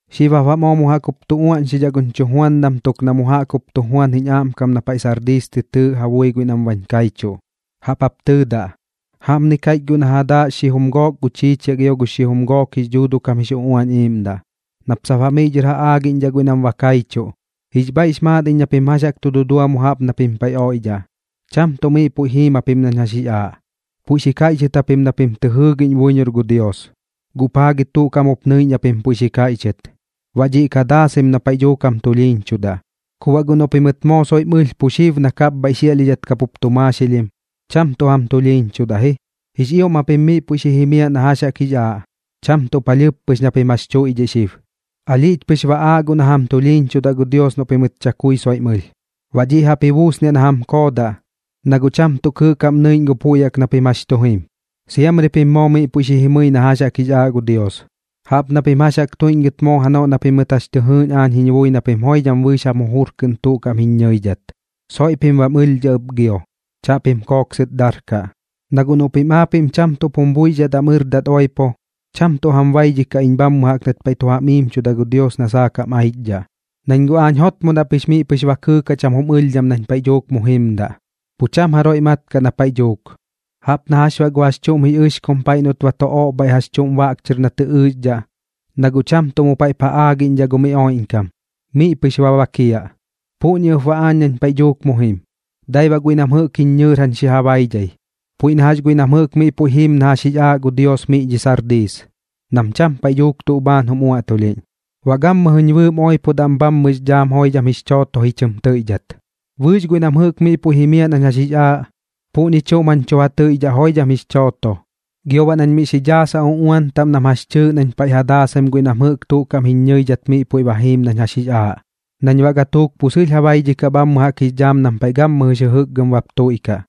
’Xib jap baꞌ moo mu jaꞌk jup tu uaꞌñxidhaꞌ guñ chujuandam tuk na mu jaꞌk jup tu juan jiñ aꞌmkam na paiꞌ Sardiis tɨ tɨɨꞌ ja bui guiꞌ nam bañ kaichuꞌ. Jaꞌp jap tɨɨdaꞌ: “Jaꞌpni kaiꞌch guiꞌ na ja daaꞌ xijum gook gu chiichiaꞌ gio gux xijum gook jix dhuuduꞌ kam jix uꞌuañ iꞌiiꞌmdaꞌ, nap sap baꞌ miꞌ dhɨr ja aagiꞌñdhaꞌ guiꞌ nam ba kaichuꞌ: Jix bhaiꞌx maat iñ na pim jax jaꞌk tu dudua mu jaꞌp na pim paiꞌ oiꞌdhaꞌ. Cham tuꞌ miꞌ puiꞌ jiim japim nañ jax jix aaꞌ, puiꞌ xi kaiꞌchɨt japim na pim tɨ jɨɨgiꞌñ buiñor gu Dios, guꞌ paa gi tuꞌ kaꞌm jup nɨiꞌñ japim puiꞌ xi kaiꞌchɨt. Baꞌ dhiꞌ ka daasaim na paiꞌ dhuuk jam tulhiiñchudaꞌ. Ku baꞌ guꞌ noꞌ pimɨt moo soiꞌm ɨlh pu xib na kapbhaiꞌ xiaꞌlhidhat kapup tu maaxilhim, cham tuꞌ jam tulhiiñchudaꞌ ji. Jix ioꞌm japim miꞌ puiꞌ xi jimiaꞌ na jax jaꞌk jix aaꞌ, cham tuꞌ palhɨɨp pɨx na pim jax tuiꞌdhiꞌ xib. Alhiꞌch pɨx ba aaꞌ guꞌ na ba jam tulhiiñchudaꞌ gu Dios noꞌ pimɨt chakui soiꞌm ɨlh, baꞌ dhiꞌ jaꞌp ji buusniaꞌ na jam koodaꞌ, na guꞌ cham tuꞌ kɨɨꞌ kaꞌm nɨiꞌñ gu puiꞌ na pim jax jaꞌk tu jim. Siamri pim moo miꞌ puiꞌ xi jimɨi na jɨꞌk jax jix aaꞌ gu Dios, jaꞌp na pim jax jaꞌk tuiꞌñgɨt moo janoꞌ na pimɨt jax tɨ jɨɨꞌñ aañ jiñ bui na pim joidham bɨɨx jam jujur kɨꞌn tuꞌ kaꞌm jiñ ñɨidhat. Soiꞌ pim bam ɨlhdhaꞌ ɨp gio, chaꞌpim kooksɨt darkaꞌ. Na guꞌ noꞌ pim aapiꞌm cham tuꞌp jum buixdhat am ɨrdat oipo, cham tuꞌ jam baidhikaꞌ iñ bhammɨ jaꞌk nat paiꞌ tu jam iimchuda gu Dios na saak jam aichdhaꞌ, nañ guꞌ aañ jotmodaꞌ pɨx miꞌ pɨx ba kɨɨkaꞌ cham jum ɨlhdham nañ paiꞌ dhuuk mu jimdaꞌ. Pu cham jaroiꞌ mat kaꞌ na paiꞌ dhuuk, jaꞌp na jax baꞌ gu jax chuꞌm jix ɨxkum paiꞌ noꞌt ba tu oꞌbhaiꞌ jax chuꞌm baꞌk chɨr na tɨ ɨɨxdhaꞌ, na guꞌ cham tuꞌ na mu paiꞌp ja aagiꞌñdhaꞌ gu mi oiꞌñkam, miꞌ pɨx ba bakiaꞌ. Puꞌñi ɨp baꞌ aañ nañ paiꞌ dhuuk mu jim. Dai baꞌ guiꞌ nam jɨꞌk jiñ ñɨɨr jañ xi ja baidhai, puiꞌ na jax guiꞌ nam jɨꞌk miꞌ puiꞌ jiim na jax jix aaꞌ gu Dios miꞌ dhiꞌ Sardiis, nam cham paiꞌ dhuuk tuꞌ bhaan jum uaꞌtulhiꞌñ. Baꞌ gammɨjɨñ bɨɨm oipodaꞌ am bhammɨx dhaam joidham jix chooto ji chɨm tɨiꞌdhat. Bɨɨx guiꞌ nam jɨꞌk miꞌ puiꞌ jimiaꞌ nañ jax jix aaꞌ, puꞌñi chuꞌm jañ tu ja tɨiꞌdhaꞌ joidham jix chooto, gio baꞌ nañ miꞌ xi ja daasaꞌ uꞌuan taꞌm nam jax chɨɨꞌ nañ paiꞌ ja daasaim guiꞌ nam jɨꞌk tuꞌ kaꞌm jiñ ñɨidhat miꞌ puiꞌ ba jiim nañ jax jix aaꞌ nañ baꞌ gatuuk pu sɨlh ja baidhikaꞌ bhammɨ jaꞌk jix dhaam nam paiꞌ gammɨjɨx jɨjɨkgɨm bap tuiꞌkaꞌ.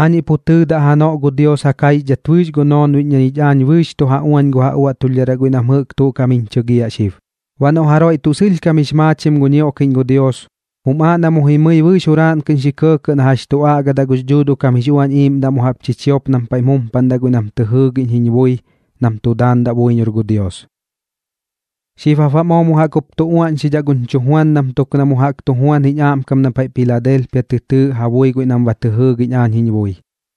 Aañiꞌ pu tɨɨdaꞌ janoꞌ gu Dios ja kaixdhat bɨɨx gu noonbiꞌñ na ñich aañ bɨɨx tu ja uañ gu ja uaꞌtulhdharaꞌ guiꞌ nam jɨꞌk tuꞌ kaꞌm jiñ chɨgiaꞌ xib. Baꞌ noꞌ jaroiꞌ tuꞌ sɨlhkam jix maachim gu ñioꞌkiꞌñ gu Dios, jum aaꞌ na mu jimɨi bɨɨx juraaꞌn kɨꞌn xi kɇɇkɇꞌ na jax tu aꞌgadaꞌ gux Dhuuduꞌ kam jix Uañ Iiꞌmdaꞌ mu jaꞌp chichiop nam paiꞌm jumpaꞌndaꞌ guiꞌ nam tɨ jɨɨgiꞌñ jiñ bui nam tu daandaꞌ buiñor gu Dios.” ’Xib jap baꞌ moo mu jaꞌk jup tu uaꞌñxidhaꞌ guñ chujuandam tuk na mu jaꞌk tu juan jiñ aꞌmkam na paiꞌ Piladelpia tɨ tɨɨꞌ ja bui guiꞌ nam ba tɨ jɨɨgiꞌñ aañ jiñ bui.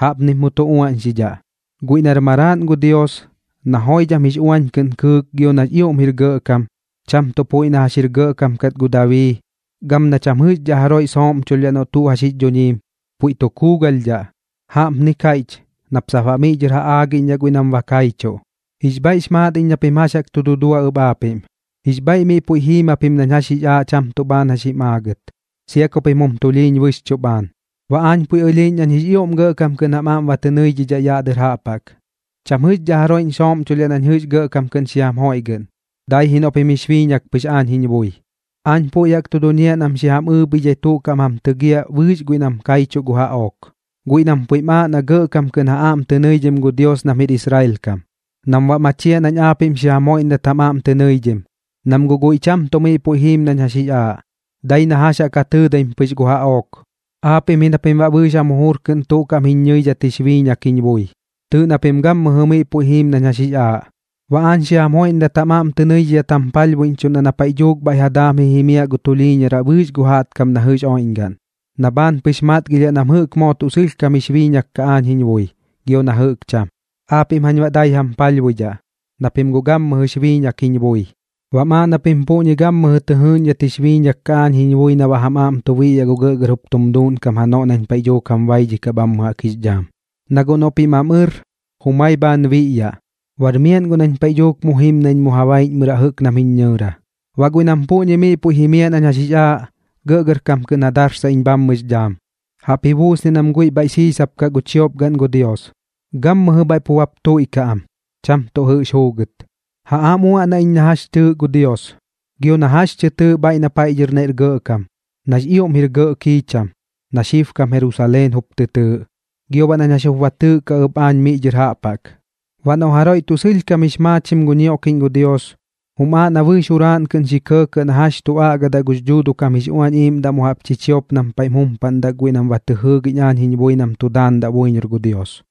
Jaꞌpnip mu tu uaꞌñxidhaꞌ: “Guiꞌ nar Maraaꞌn gu Dios, na joidham jix uañ kɨꞌn kɨɨk gio nax ioꞌm jir gɇꞌkam, cham tuꞌ puiꞌ na jɨꞌx jir gɇꞌkam kat gu Dabii, gam na cham jɨꞌxdhaꞌ jaroiꞌ sooꞌmchulhdhaꞌ noꞌ tuꞌ jax jix dhuñiim, puiꞌ tu kuugalhdhaꞌ. Jaꞌpni kaiꞌch nap sap baꞌ miꞌ dhɨr ja aagiꞌñdhaꞌ guiꞌ nam ba kaichuꞌ: Jix bhaiꞌx maat iñ na pim jax jaꞌk tu dudua ɨp aapiꞌm. Jix bhaiꞌ miꞌ puiꞌ jiim japim nañ jax jix aaꞌ cham tuꞌ bhaan jax jim aagɨt, sia ku pim jum tulhiiñ bɨxchuꞌ bhaan. Baꞌ aañ puiꞌ ɨlhiiꞌñ nañ jix ioꞌm gɇꞌkam kɨꞌn jam aꞌm ba tɨ nɨidhidhaꞌ yaꞌ dɨr jaꞌp jaꞌk, cham jɨꞌxdhaꞌ jaroiꞌñ sooꞌmchulhdhaꞌ nañ jɨꞌx gɇꞌkam kɨꞌn xi jam joiꞌgɨꞌn, dai ji noꞌ pim jix biiñak pɨx aañ jiñ bui. Aañ puiꞌ jaꞌk tu duñiaꞌ nam xi jam ɨɨbhidhai tuꞌ kaꞌm jam tɨgiaꞌ bɨɨx guiꞌ nam kaichuꞌ gu jaꞌook, guiꞌ nam puiꞌm aaꞌ na gɇꞌkam kɨꞌn ja aꞌm tɨ nɨidhim gu Dios nam jir Israel kam, nam baꞌ machiaꞌ nañ aapiꞌm xi jam joiꞌndat jam aꞌm tɨ nɨidhim, nam guꞌ guiꞌ cham tuꞌ miꞌ puiꞌ jiim nañ jax jix aaꞌ, dai na jax jaꞌk ja tɨɨdaim pɨx gu jaꞌook. Aapiꞌm ji na pim baꞌ bɨɨx jam jujur kɨꞌn tuꞌ kaꞌm jiñ ñɨidhat jix biiñak jiñ bui, tɨɨꞌ na pim gammɨjɨ miꞌ puiꞌ jiim nañ jax jix aaꞌ. Baꞌ aañ xi jam joiꞌndat jam aꞌm tɨ nɨidhidhat jam palhbuiꞌñchuꞌndaꞌ na paiꞌ dhuuk bhaiꞌ ja daam ji jimiaꞌ gu tulhiiñaraꞌ bɨɨx gu jaꞌtkam na jɨꞌx oiꞌñgaꞌn, na bhaan pɨx matgilhiaꞌ nam jɨꞌk moo tuꞌ sɨlhkam jix biiñak kaꞌ aañ jiñ bui, gio na jɨꞌk cham. Aapiꞌm jañ baꞌ dai jam palhbuidhaꞌ, na pim guꞌ gammɨjɨx biiñak jiñ bui. Baꞌm aaꞌ na pim puꞌñi gammɨjɨ tɨ jɨɨꞌñdhat jix biiñak kaꞌ aañ jiñ bui na baꞌ jam aꞌm tu biꞌyaꞌ gu gɇꞌgɇr jup tum duuꞌnkam janoꞌ nañ paiꞌ dhuuk jam baidhikaꞌ bhammɨ jaꞌk jix dhaam. Na guꞌ noꞌ pim am ɨr, jumai bhaan biꞌyaꞌ. Bar miaꞌn guꞌ nañ paiꞌ dhuuk mu jim nañ mu ja baiꞌñmɨraꞌ jɨꞌk nam jiñ ñɨɨra. Baꞌ guiꞌ nam puꞌñi miꞌ puiꞌ jimiaꞌ nañ jax jix aaꞌ, gɇꞌgɇrkam kɨꞌn ja darsaꞌ iñ bhammɨx dhaam, jaꞌp ji buusniaꞌ nam guiꞌ bhaiꞌ siisap kaꞌ gu chiop gaꞌn gu Dios. Gammɨjɨ bhaiꞌ pu bap tuiꞌkaꞌ am, cham tuꞌ jɨꞌx juugɨt. Ja aꞌm uaꞌnaꞌ iñ na jax chɨɨꞌ gu Dios gio na jax tɨ tɨɨꞌ bhaiꞌ na paiꞌ dhɨr naiꞌr gɇꞌkam, nax ioꞌm gɇꞌr kiicham, na xibkam Jerusaleen jup tɨ tɨɨꞌ, gio baꞌ nañ jax jup ba tɨɨꞌkaꞌ ɨp aañ miꞌ dhɨr jaꞌp jaꞌk. Baꞌ noꞌ jaroiꞌ tuꞌ sɨlhkam jix maachim gu ñioꞌkiꞌñ gu Dios, jum aaꞌ na bɨɨx juraaꞌn kɨꞌn xi kɇɇkɇꞌ na jax tu aꞌgadaꞌ gux Dhuuduꞌ kam jix Uañ Iiꞌmdaꞌ mu jaꞌp chichiop nam paiꞌm jumpaꞌndaꞌ guiꞌ nam ba tɨ jɨɨgiꞌñ aañ jiñ bui nam tu daandaꞌ buiñor gu Dios.”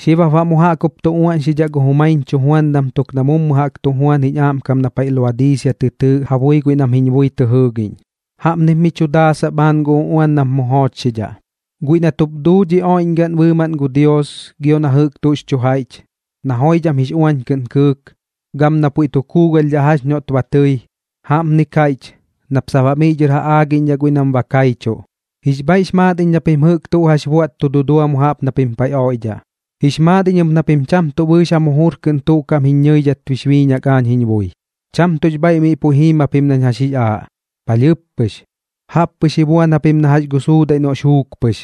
’Xib jap baꞌ mu jaꞌk jup tu uaꞌñxidhaꞌ gu jumaiñ chujuandam tuk na mummu jaꞌk tu juan jiñ aꞌmkam na paiꞌ Laodiisia tɨ tɨɨꞌ ja bui guiꞌ nam jiñ bui tɨ jɨɨgiꞌñ. Jaꞌpnip miꞌ tu daasaꞌ bhaan gu uꞌuan nap mu joochxidhaꞌ: “Guiꞌ nat jup duu dhi oiꞌñgaꞌn bɨɨmaꞌn gu Dios gio na jɨꞌk tuꞌx chu jaiꞌch, na joidham jix uañ kɨꞌn kɨɨk, gam na puiꞌ tu kuugalhdhaꞌ jax noꞌt ba tɨi, jaꞌpni kaiꞌch nap sap baꞌ miꞌ dhɨr ja aagiꞌñdhaꞌ guiꞌ nam ba kaichuꞌ: Jix bhaiꞌx maat iñ na pim jɨꞌk tuꞌ jax buaꞌt tu dudua mu jaꞌp na pim paiꞌ oiꞌdhaꞌ. Jix maat iñ ɨp na pim cham tuꞌ bɨɨx jam jujur kɨꞌn tuꞌ kaꞌm jiñ ñɨidhat jix biiñak aañ jiñ bui. Cham tuꞌx bhaiꞌ miꞌ puiꞌ jiim japim nañ jax jix aaꞌ, palhɨɨp pɨx. Jaꞌp pɨx ji buan japim na jax gu suudaiꞌ noꞌx juuk pɨx,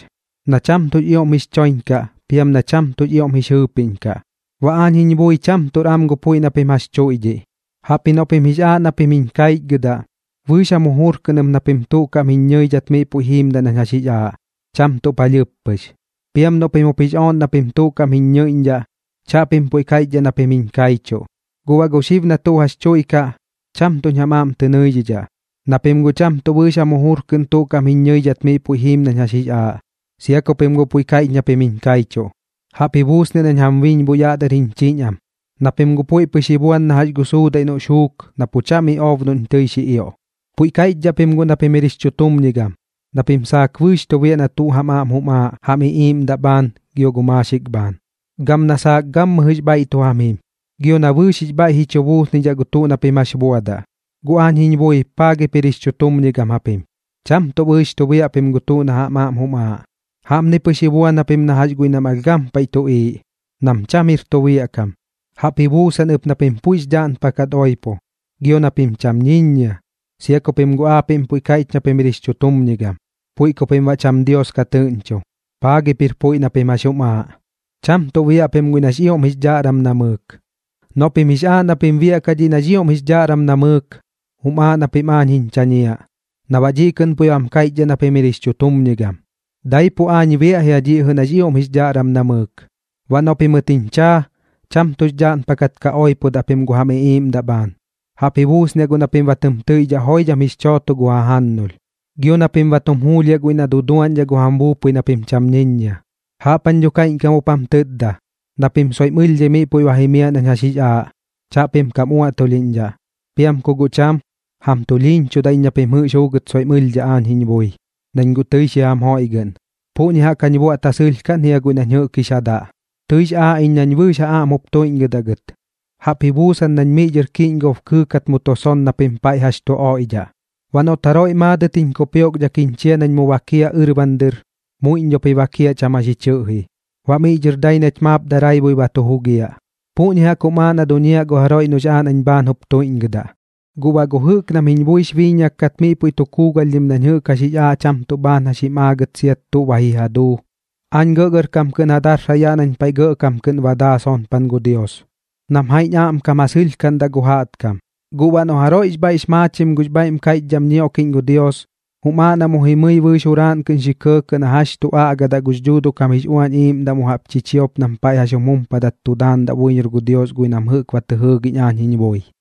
na cham tuꞌx ioꞌm jix choiñ kaꞌ piam na cham ioꞌm jix jɨɨpiꞌñ kaꞌ. Baꞌ aañ jiñ bui cham tuꞌr am gu puiꞌ na pim jax tuiꞌdhiꞌ, jaꞌpji noꞌ pim jix aaꞌ na pim jiñ kaichgɨdaꞌ, bɨɨx jam jujur kɨꞌn ɨp na pim tuꞌ kaꞌm jiñ ñɨidhat miꞌ puiꞌ jiimdaꞌ nañ jax jix aaꞌ, cham tuꞌ palhɨɨp pɨx. Piam noꞌ pim jup jix ooꞌn na pim tuꞌ kaꞌm jiñ ñɨiꞌñdhaꞌ, chaꞌpim puiꞌ kaiꞌchdhaꞌ na pim jiñ kaichuꞌ. Guꞌ baꞌ gu xib na tuꞌ jax tuiꞌkaꞌ, cham tuꞌñ jam aꞌm tɨ nɨidhidhaꞌ, na pim guꞌ cham tuꞌ bɨɨx jam jujur kɨꞌn tuꞌ kaꞌm jiñ ñɨidhat miꞌ puiꞌ jiim nañ jax jix aaꞌ, sia ku pim guꞌ puiꞌ kaiꞌch na pim jiñ kaichuꞌ. Jaꞌp ji buusniaꞌ nañ jam biñboꞌ yaꞌ dɨr jiñ chiñ am, na pim guꞌ puiꞌ pɨx ji buan na jax gu suudaiꞌ noꞌx juuk na pu cham iꞌoob noꞌñ tɨi xi ioꞌ. Puiꞌ kaiꞌchdhaꞌ pim guꞌ na pim jir jix chutumñigam, na pim saak bɨɨx tu biaꞌ na tuꞌ jam aꞌm jum aaꞌ jam iꞌiiꞌmdaꞌ bhaan gio gu maaxik bhaan, gam na saak gammɨjɨx bhaiꞌ tu jam jim, gio na bɨɨx jix bhaiꞌ ji chu buusnidhaꞌ gu tuꞌ na pim jax buadaꞌ. Guꞌ aañ jiñ bui, paa gip jir jix chutumñigam japim. Cham tuꞌ bɨɨx tu biaꞌ pim na tuꞌ jam aꞌm jum aaꞌ. Jaꞌpni pɨx ji buan japim na jax guiꞌ nam alh gampaiꞌ tuꞌiiꞌ, nam cham jir tu biaꞌ kam. Jaꞌp ji buusan ɨp na pim puiꞌx dhaꞌnpakat oipo, gio na pim cham ñiññia, sia ku pim guꞌ aapiꞌm puiꞌ kaiꞌch na pim jir jix chutumñigam, puiꞌ ku pim baꞌ cham Dios ka tɨꞌñcho. Paa gip jir puiꞌ na pim jax jum aaꞌ. Cham tuꞌ biaꞌ pim guiꞌ nax ioꞌm jix dhaꞌram namɨɨk. Noꞌ pim jix aaꞌ na pim biaꞌkaꞌ dhiꞌ nax ioꞌm jix dhaꞌram namɨɨk, jum aaꞌ na pim aañ jiñ chañiaꞌ, na baꞌ dhiꞌ kɨꞌn puiꞌ bam kaiꞌchdhaꞌ na pim jir jix chutumñigam. Daipuꞌ aañ biaꞌ jia dhiꞌ jɨꞌ nax ioꞌm jix dhaꞌram namɨɨk. Baꞌ noꞌ pimɨt jiñ chaa, cham tuꞌx dhaꞌnpakat ka oipodaꞌ pim gu jam iꞌiiꞌmdaꞌ bhaan, jaꞌp ji buusniaꞌ guꞌ na pim ba tɨm tɨiꞌdhaꞌ joidham jix chooto gu jajannulh, gio na pim ba tum juulhiaꞌ guiꞌ na duduaꞌñdhaꞌ gu jam buupui na pim cham ñiññiaꞌ. Jaꞌp jañ dho kaiꞌñkam jup jam tɨtda, na pim soiꞌm ɨlhdhai miꞌ puiꞌ ba jimiaꞌ nañ jax jix aaꞌ, chaꞌpim kam uaꞌtulhiꞌñdhaꞌ. Piam ku guꞌ cham, jam tulhiiñchudaꞌ iñ na pim jɨꞌx pɨx juugɨt soiꞌm ɨlhdhaꞌ aañ jiñ bui, nañ guꞌ tɨi xi jam joiꞌgɨꞌn. Puꞌñi jaꞌk jañ ja buaꞌt ja sɨlhkaꞌn jia guiꞌ nañ jɨꞌk jix ja daꞌ. Tɨix aaꞌ iñ nañ bɨɨx jam aꞌm jup tuiꞌñgɨdaꞌ gɨt, jaꞌp ji buusan nañ miꞌ dhɨr kiꞌñgob kɨɨkat mu tu son na pim paiꞌ jax chu oiꞌdhaꞌ. Baꞌ noꞌt jaroiꞌ maadɨt jiñ kupioꞌkdhak jiñ chia nañ mu bakiaꞌ ɨrban dɨr, muiꞌñ dhop ji bakiaꞌ cham jax ji chɨꞌji, baꞌ miꞌ dhɨr dai nach maap daraibui ba tu jugiaꞌ. Puꞌñi jaꞌk jum aaꞌ na duñiaꞌ gu jaroiꞌ noꞌx aaꞌ nañ bhaan jup tuiꞌñgɨdaꞌ. Guꞌ baꞌ gu jɨꞌk nam jiñ buix biiñak kat miꞌ puiꞌ tu kuugalhdhim nañ jɨꞌk jax jix aaꞌ cham tuꞌ bhaan jax jim aagɨt sia tuꞌ ba ji ja duu, aañ gɇꞌgɇrkam kɨꞌn ja darsaꞌ yaꞌ nañ paiꞌ Gɇꞌkam kɨꞌn ba daa sonpan gu Dios, nam jaiꞌñ aꞌmkam ja sɨlhkaꞌndaꞌ gu jaꞌtkam. Guꞌ baꞌ noꞌ jaroiꞌx bhaiꞌx maachim gux bhaiꞌm kaiꞌchdham ñioꞌkiꞌñ gu Dios, jum aaꞌ na mu jimɨi bɨɨx juraaꞌn kɨꞌn xi kɇɇkɇꞌ na jax tu aꞌgadaꞌ gux Dhuuduꞌ kam jix Uañ Iiꞌmdaꞌ mu jaꞌp chichiop nam paiꞌm jumpadat tu daandaꞌ buiñor gu Dios guiꞌ nam jɨꞌk ba tɨ jɨɨgiꞌñ aañ jiñ bui.”